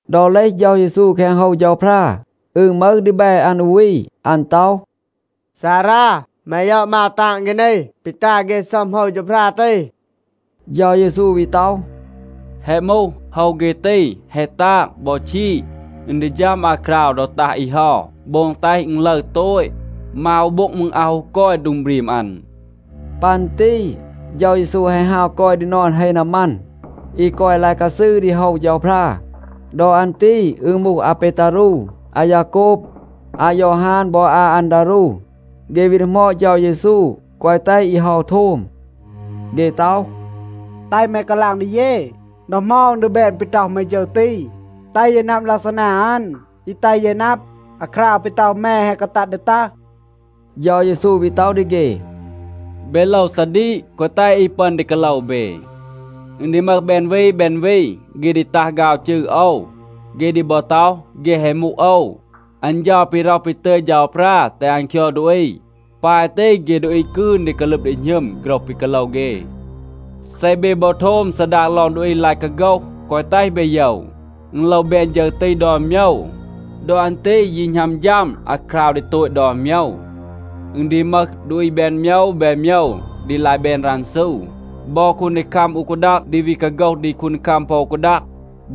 ดอ เลห เฌา เยซู แคง โฮว เฌาพรา, อึณ มึห ดีแบ อัน อู วี, อัน ต็อห, “ซารา, แม ยอด มาว ตาง เฆ นี, ปี ตา เฆ ซัม โฮว เฌาพรา ตี.” เฌา เยซู วี ต็อห, “แฮะ มูห. โฮว เฆ ตี แฮะ ตาง บอ ชีด. อึณ ดี ฌัม อาคราว ดอ ตัห อี เฮา, โบง แตห อึณ ลึร โตต. มาว อู โบ็ง มืร อาว ฮู กอย โดง บรีม อัน.” ปัน ตี เฌา เยซู แฮะ ฮาว กอย ดี นอน เฮ นามัน, อี กอย ลาย กาซืร ดี โฮว เฌาพรา. ดอ อัน ตี อึณ มูห อาเปตารู, อายาโกบ, อายอฮาน บอ อาอันดารู. เฆ วี ดีหมอด เฌา เยซู แกวะ แตห อี เฮา โทม. เฆ ต็อห, “แตห แม กาลาง ดี เย, ดอ เหมา อึณ ดี แบน ปี ต็อห แม ฌึร ตี. แตห เย นับ ลักซานา อัน อี แตห เย นับ, อาคราว ปี ต็อห แม แฮะ กาตัด ดี ตัห.” เฌา เยซู วี ต็อห ดี เฆ, “เบ โลว ซาดีก, แกวะ แตห อี ปึอน ดี กาโลว เบ. อึณ ดี มึห แบน วี แบน วี, เฆ ดี ตัห ฆาว จืร โอว. เฆ ดี บอ ต็อห, เฆ แฮะ มูห โอว, อัน เฌา ปี ร็อห ปี ตึย เฌาพรา แตห อัน คยอด ดูอี. ปาย ตี เฆ ดูอี กืน ดี กาลึบ ดี หณึม โฆรห ปี กาโลว เฆ. เซ เบ บอ โทม ซาดาง ลอง ดูอี ลาย กาโฆห, แกวะ แตห เบ โยว. อึณ โลว แบน ฌึร ตี ดอน โมยว. ดอ อัน ตี ยี หณัม ฌัม อาคราว ดี โตต ดอน โมยว. อึณ ดี มึห ดูอี แบน โมยว แบน โมยว, ดี ลาย แบน รันซู. บอ คูนดีคัม อู กาดัง ดี วี กาโฆห ดี คูนดีคัม ปอ อู กาดัง.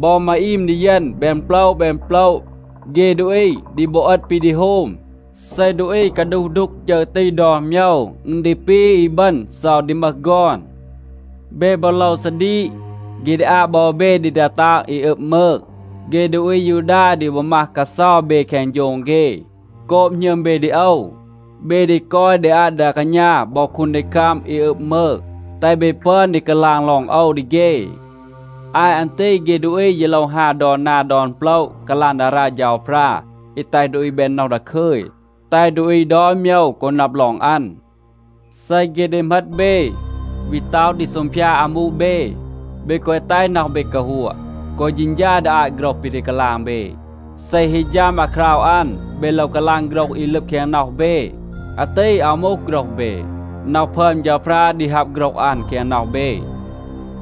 บอ มาอีม ดีเยณ แบน โปละ แบน โปละ. เฆ ดูอี ดี บอ เอต ปี ดี โฮม. เซ ดูอี กาดูห ดูก ฌึร ตี ดอน โมยว, อึณ ดี ปี อีบึณ เซา ดี มึห ฆอน. เบ บอ โลว ซาดีก. เฆ ดี อาบ บอ เบ ดี ดา ตาง อี อึบ มืง. เฆ ดูอี อายูดา ดี บอ มัห กาเซา เบ แคง โฌง เฆ. โกบ หณึม เบ ดี โอว, เบ ดี กอย ดี อาต ดา กาณา บอ คูนดีคัม อี อึบ มืง, แตห เบ ปึอน ดี กาลาง ลอง โอว ดี เฆ. อาต อัน ตี, เฆ ดูอี ยี โลว ฮาว ดอน นา ดอน โปละ กาลาง ดารา เฌาพรา อี แตห ดูอี แบน น็อห ดาคึย, แตห ดูอี ดอน โมยว กอ นับ ลอง อัน. เซ เฆ ดี เหมต เบ, วี ต็อห ดี ซูงพยาด อามู เบ, เบ แกวะ แตห น็อห เบ กาฮัวะ, แกวะ เฌณฌา ดี อาต โฆรห ปี ดี กาลาง เบ. เซ ฮี ฌัม อาคราว อัน, เบ โลว กาลาง โฆรห อี ลึบ แคง น็อห เบ. อาตี อาว มูห โฆรห เบ. น็อห พึอม เฌาพรา ดี ฮับ โฆรห อัน แคง น็อห เบ.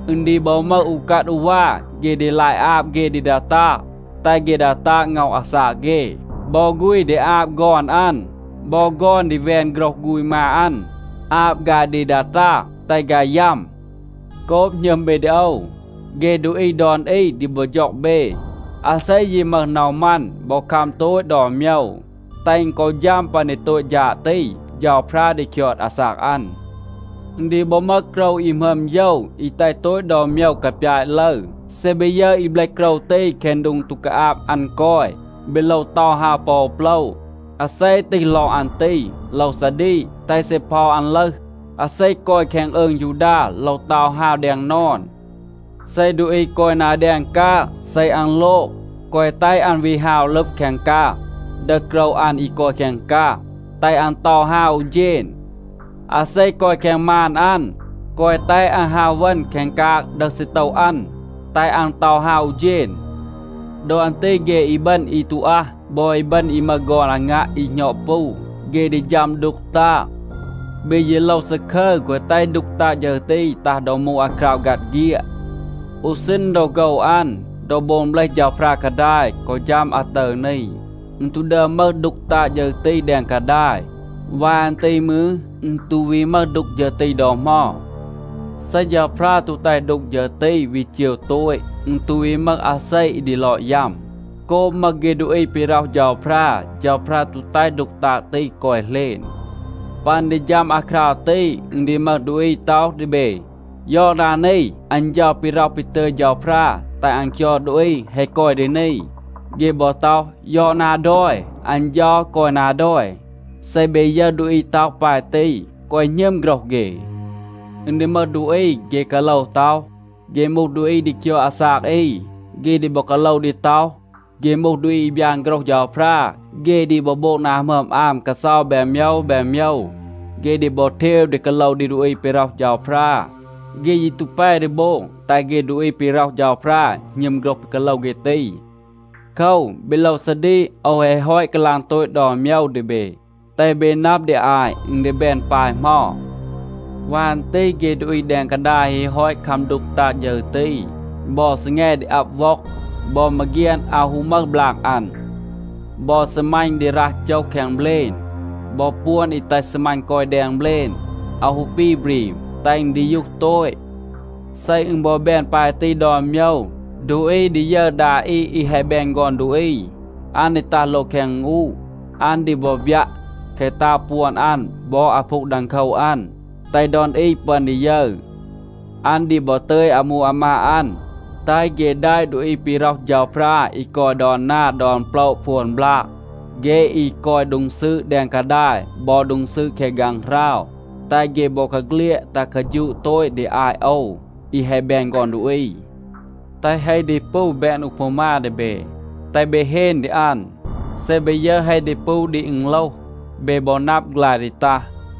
อึณ ดี บอ มึห อูกัด อูวา, เฆ ดี ลาย อาบ เฆ ดี ดา ตาง, แตห เฆ ดา ตาง ง็อห อาซาก เฆ. บอ ฆูณ ดี อาบ ฆอน อัน. บอ ฆอน ดี แวน โฆรห ฆูณ มา อัน, อาบ ฆาย ดี ดา ตาง, แตห ฆาย ยัม. โกบ หณึม เบ ดี โอว, เฆ ดูอี ดอน อี ดี บอ ฌ็อง เบ. อาเซ ยี มึห น็อห มัน บอ คัม โตต ดอน โมยว, แตห อึณ กอ ฌัม ปัน ดี โตต ฌาด ตี, เฌาพรา ดี คยอด อาซาก อัน. อึณ ดี บอ มึห โกรว อี หมึอม โยว, อี แตห โตต ดอน โมยว กาปยาต ลึร. เซ เบ ยึร อี เบลห โกรว ตี แคง โดง ตู กาอาบ อัน กอย, เบ โลว เตา ฮาว ปอ โปละ. (อาเซ ตีห ลอง อัน ตี โลว ซาดีก, แตห ซีเพา อัน ลึห). อาเซ กอย แคง อืง ยูดา โลว เตา ฮาว แดง นอน. เซ ดูอี กอย นา แดง กาง,a เซ อัน โลง, แกวะ แตห อัน วี ฮาว ลึบ แคง กาง, ดึห โกรว อัน อี กอย แคง กาง. แตห อัน เตา ฮาว อู เฌณ. อาเซ กอย แคง มาน อัน, แกวะ แตห อัน ฮาว เวณ แคง กาง ดึห ซีโตว อัน, แตห อัน เตา ฮาว อู เฌณ. ดอ อัน ตี เฆ อีบึณ อี ตู อัห, บอ อีบึณ อี มึห ฆอน อางัะ อี หณอด ปู, เฆ ดี ฌัม ดูก ตาง. เบ ยี โลว ซาคึร, แกวะ แตห ดูก ตาง ฌึร ตี ตัห ดอ มูห อาคราว ฆัด เฆียด. อู ซีณ ดอ โฆว อัน, ดอ โบง เบลห เฌาพรา กาดาย, กอ ฌัม อาตึร นี, อึณ ตู ดึอม มึห ดูก ตาง ฌึร ตี แดง กาดาย. วาย อัน ตี มืร, อึณ ตู วี มึห ดูก ฌึร ตี ดอ เหมา. เซ เฌาพรา ตู แตห ดูก ฌึร ตี วี เจว โตต, อึณ ตู วี มึห อาเซ อี ดี ลอด ยัม. โกบ มึห เฆ ดูอี ปี ร็อห เฌาพรา, เฌาพรา ตู แตห ดูก ตาง ตี กอย เหลณ. ปัน ดี ฌัม อาคราว ตี, อึณ ดี มึห ดูอี ต็อห ดี เบ, ‘ยอด นา นี, อัน เฌา ปี ร็อห ปี ตึย เฌาพรา แตห อัน คยอด ดูอี แฮะ กอย ดี นี.’ เฆ บอ ต็อห, ‘ยอด นา ดอย, อัน เฌา กอย นา ดอย.’ เซ เบ ยึร ดูอี ต็อห ปาย ตี, แกวะ หณึม โฆรห เฆ. อึณ ดี มึห ดูอี, เฆ กาโลว ต็อห, เฆ มูห ดูอี ดี คยอด อาซาก อี. เฆ ดี บอ กาโลว ดี ต็อห, เฆ มูห ดูอี อี บยาน โฆรห เฌาพรา. เฆ ดี บอ โบง นา หมึอม อาม กาเซา แบน โมยว แบน โมยว. เฆ ดี บอ เทว ดี กาโลว ดี ดูอี ปี ร็อห เฌาพรา. เฆ ยี ตู แป ดี โบง แตห เฆ ดูอี ปี ร็อห เฌาพรา หณึม โฆรห ปี กาโลว เฆ ตี. โคว, เบ โลว ซาดีก. โอว แฮะ ฮอต กาลาง โตต ดอน โมยว ดี เบ, แตห เบ นับ ดี อาต, อึณ ดี แบน ปาย เหมา. วาย อัน ตี เฆ ดูอี แดง กาดาย ฮี ฮอต คัม ดูก ตาง ฌึร ตี, บอ ซีแง ดี อับ ว็อง. บอ มาเฆียน อาว ฮู มึห บลาง อัน. บอ ซีมัณ ดี รัห โจห แคง เบลณ. บอ ปวน อี แตห ซีมัณ กอย แดง เบลณ, อาว ฮู ปี บรีม, แตห อึณ ดียูห โตต. เซ อึณ บอ แบน ปาย ตี ดอน โมยว, ดูอี ดี ยึร ดา อี อี แฮะ แบน ฆอน ดูอี. อัน ดี ตัห โลง แคง อึณอูะ. อัน ดี บอ บยัะ แคะ ตาง ปวน อัน บอ อาพูง ดังโคว อัน, แตห ดอน อี ปึอน ดี ยึร. อัน ดี บอ ตึย อามู อามาด อัน, แตห เฆ แดะ ดูอี ปี ร็อห เฌาพรา อี กอย ดอน นา ดอน โปละ พวน บลาก. เฆ อี กอย โดง ซืด แดง กาดาย บอ โดง ซืด แคง ฆางหราว, แตห เฆ บอกาเฆลียด ตัห กาฌูะ โตต ดี อาต โอว, อี แฮะ แบน ฆอน ดูอี. แตห เฮ ดีปู แบน อูพามา ดี เบ, แตห เบ เฮน ดี อัน. เซ เบ ยึร เฮ ดีปู ดี อึณโลห, เบ บอ นับ, ฆลาย ดี ตัห.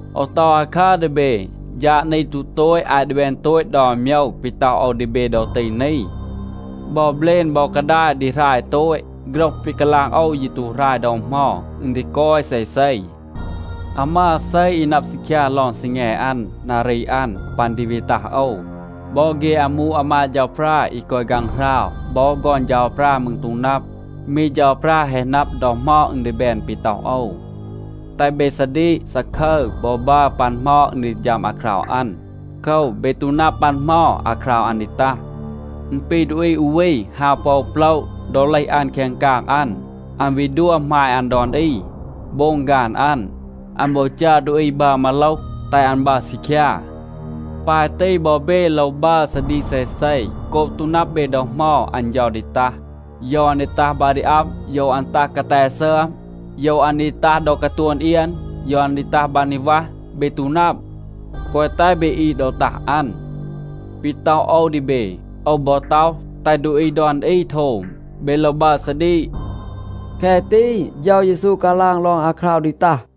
โอว ต็อห อาคัร ดี เบ, ฌาด นี ตู โตต อาต ดี แบน โตต ดอน โมยว ปี ต็อห โอว ดี เบ ดอ ตี นี. บอ เบลณ บอ กาดาย ดี หราย โตต. โฆรห ปี กาลาง โอว ยี ตู หราย ดอ เหมา. อึณ ดี กอย เซเซ. อาว มึห อาเซ, อี นับ ซีคยา ลอง ซีแง อัน, นารี อัน, ปัน ดี วี ตัห โอว. บอ เฆ อามู อามาด เฌาพรา, อี กอย ฆางหราว, บอ ฆอน เฌาพรา มืร ตู นับ. มี เฌาพรา แฮะ นับ ดอ เหมา อึณ ดี แบน ปี ต็อห โอว. แตห เบ ซาดีก, ซาคึร บอ บัร ปัน เหมา อึณ ดี ฌัม อาคราว อัน. โคว, เบ ตู นับ ปัน เหมา อาคราว อัน ดี ตัห. อึณ ปี ดูอี อู วี ฮาว ปอ อู โปละ. ดอ เลห อัน แคง กาง อัน, อัน วี ดัว หมาย อัน ดอน อี โบง ฆาน อัน. อัน บอ จัร ดูอี บัร มาโลห, แตห อัน บัร ซีคยา. ปาย ตี บอ เบ โลว บัร ซาดีก เซเซ, โกบ ตู นับ เบ ดอ เหมา อัน เฌา ดี ตัห. โยว อัน ดี ตัห บา ดี อับ, โยว อัน ตัห กาแต ซึอม, โยว อัน ดี ตัห ดอ กาตวน เอียน, โยว อัน ดี ตัห บาง ดี วัห, เบ ตู นับ. แกวะ แตห เบ อีด ดอ ตัห อัน. ปี ต็อห โอว ดี เบ, โอว บอ ต็อห, แตห ดูอี ดอน อี โทม. เบ โลว บัร ซาดีก.” แคะ ตี เฌา เยซู กาลาง ลอง อาคราว ดี ตัห.